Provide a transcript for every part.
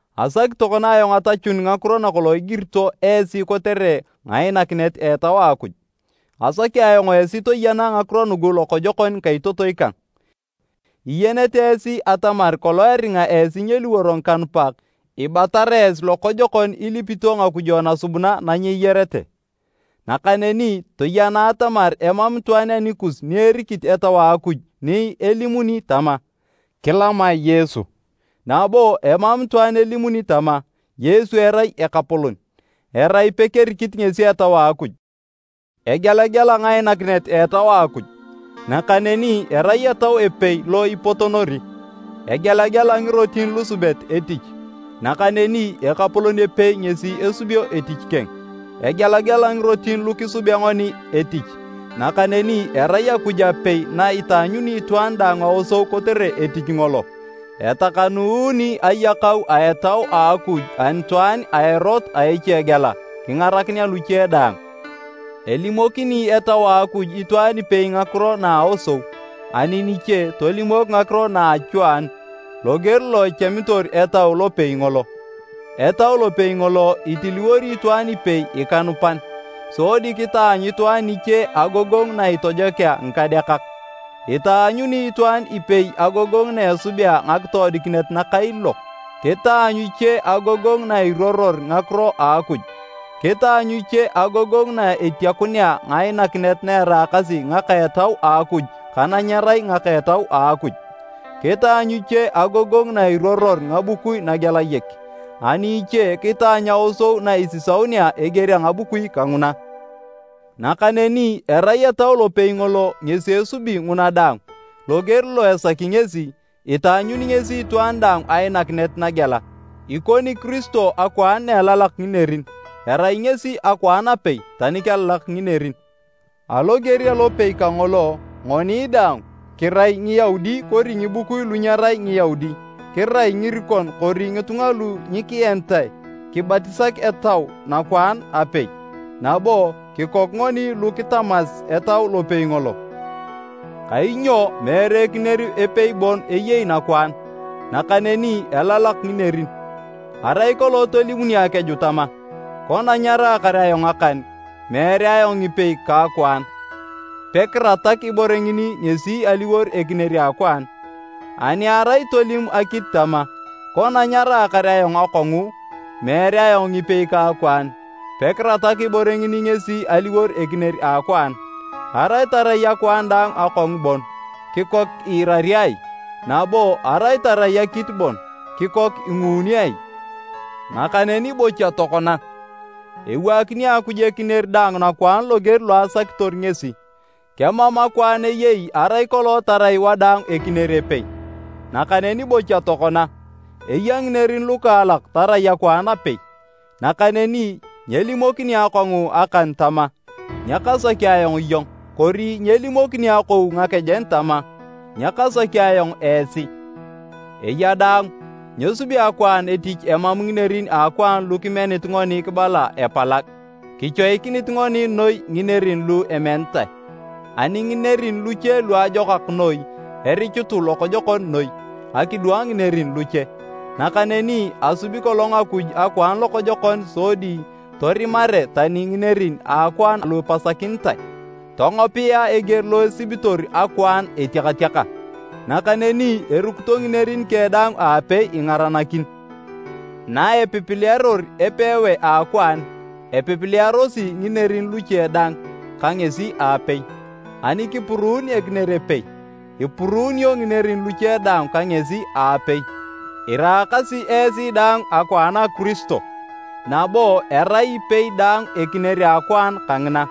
Asaki tokona ayong atachun ngakiro nakolong igirito esi kotere ngainakinet a Etau a Akuj. Asaki ayong esi toyena ngakiro nugu lokojokon ngikaitotoi kang. Iyenete esi atamar kolong eringa esi nyeliworo ngikanupak, ibatara esi lokojokon ilipito ngakujo nasubuna na nyeyarete. Nakaneni toyena atamar emam itwaan anikus ni erikit Etau a Akuj ni elimuni tama, “Kilamae Yesu!” nabo emam itwaan elimuni tama, “Yesu erai Ekapolon,” erai pekerikit ngesi Etau a Akuj. Egelagela ngainakinet a Etau a Akuj, nakaneni erai Etau epei lo ipotonori. Egelagela ngirotin lusubet etich, nakaneni Ekapolon epei ngesi esubio etich keng. Egelagela ngirotin lu kisubea ngoni etich, nakaneni erai Akuj apei na itaanyuni itwaan daang aosou kotere etich ngolo. Etakanuuni ayakau a Etau a Akuj anitwaan a erot a echegela, kingarakinea luche daang. Elimokini Etau a Akuj itwaan ipei ngakiro na a aosou, ani niche tolimok ngakiro na a achwaanu, loger lo echamitor Etau lopei ngolo. Etau lopei ngolo, itiliwori itwaan ipei ikanupan, sodi kitaanyu itwaan niche agogongu na itojokea ngikadeakak. Itaanyuni itwaan ipei agogongu na esubea ngakitoodikinet nakailiilok, kitaanyu iche agogongu nairuoror ngakiro a Akuj, kitaanyu iche agogongu na etiakunea ngainakinet na eraakasi ngaka a Etau a Akuj ka na nyerai ngaka a Etau a Akuj. Kitaanyu iche agogongu nairuoror ngabukui nagelayek, ani iche kitaanyu aosou na isisaunea eger a ngabukui kanguna. Nakaneni erai Etau lopei ngolo ngesi esubi nguna daang, loger lo esaki ngesi, itaanyuni ngesi itwaan daang ainakinet nagela. Ikoni Kiristo akwaan na elalak nginerin, erai ngesi akwaan apei tani kelalak nginerin. Aloger alopei kangolo, ngoni daang, kirai Ngiyaudi kori ngibukui lu nyerai Ngiyaudi, kirai ngirikon kori ngitunga lu nyikienitae, kibatisak Etau nakwaan apei, nabo kikok ngoni lu kitamas Etau lopei ngolo. Kainyo meere ekinier epei bon eyei nakwaan, nakaneni elalak nginerin. Arai kolong tolimuni akeju tama, “Kona nyaraakar ayong akan, meere ayong ngipei ka akwaan,” pekiratak ibore ngini ngesi aliwor ekinier a akwaan. Ani arai tolim akit tama, “Kona nyaraakar ayong akongu, meere ayong ngipei ka akwaan,” pekiratak ibore ngini ngesi aliwor ekinier a akwaan. Arai tarai akwaan daang akongu bon, kikok iirari ai? Nabo arai tarai akit bon, kikok inguuni ai? Nakaneni bocha tokona, ewaakini Akuj ekinier daang nakwaan loger lo asakitor ngesi. Kemam akwaan eyei arai kolong tarai wadaang ekinier epei! Nakaneni bocha tokona, eya nginerin lukaalak tarai akwaan apei. Nakaneni nyelimokini akongu akan tama, “Nyakasaki ayong iyong!” Kori nyelimokini akou ngakejen tama, “Nyakasaki ayong esi!” Eya daang, nyesubi akwaan etich emam nginerin a akwaan lu kimenit ngoni kibala epalag. Kichoikinit ngoni noi nginerin lu emenitae, ani nginerin luche luajokak noi erichutu lokojokon noi, akidwang nginerin luche. Nakaneni asubi kolong Akuj akwaan lokojokon sodi torimare tani nginerin a akwaan lu ipasakinitae, tongopea eger lo esibitor akwaan etiakatiaka, nakaneni erukito nginerin keng daang aapei ingaranakin. Naepipilearor epewae a akwaan, epipilearosi nginerin luche dang ka ngesi aapei. Ani kipuruun ekinier epei, ipuruunio nginerin luche dang ka ngesi aapei. Iraakasi esi daang akwaan a Kiristo, nabo erai ipei daang ekinier a akwaan kangina.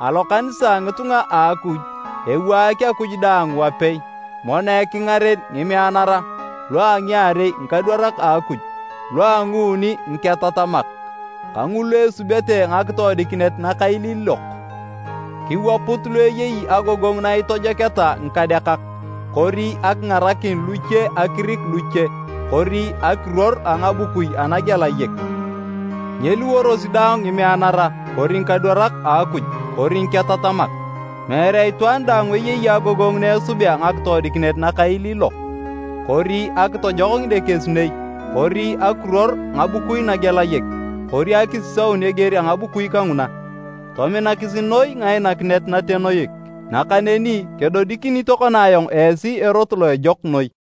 Alokanisa a ngitunga a Akuj, ewaak Akuj daang wapei: Mono ekingaren ngimeanara, lu a ngiarei ngikadwarak a Akuj, lua nguuni, ngiketatamak, ka ngulu esubete ngakitoodikinet nakailiilok, kiwaput lu eyei agogongu na itojoketa ngikadeakak kori akingarakin luche kori akirik luche kori akiruor a ngabukui anagelayek. Nyeliworosi daang ngimeanara kori ngikadwarak a Akuj kori ngiketatamak. Meere itwaan daang eyei agogongu na esubea ngakitoodikinet nakailiilok kori akitojok ngidekesinei kori akiruor ngabukui nagelayek kori akisisaun eger a ngabukui kanguna. Tominakisi noi ngainakinet natenoik. Nakaneni, kedodikini tokona ayong esi erot lo ejok noi.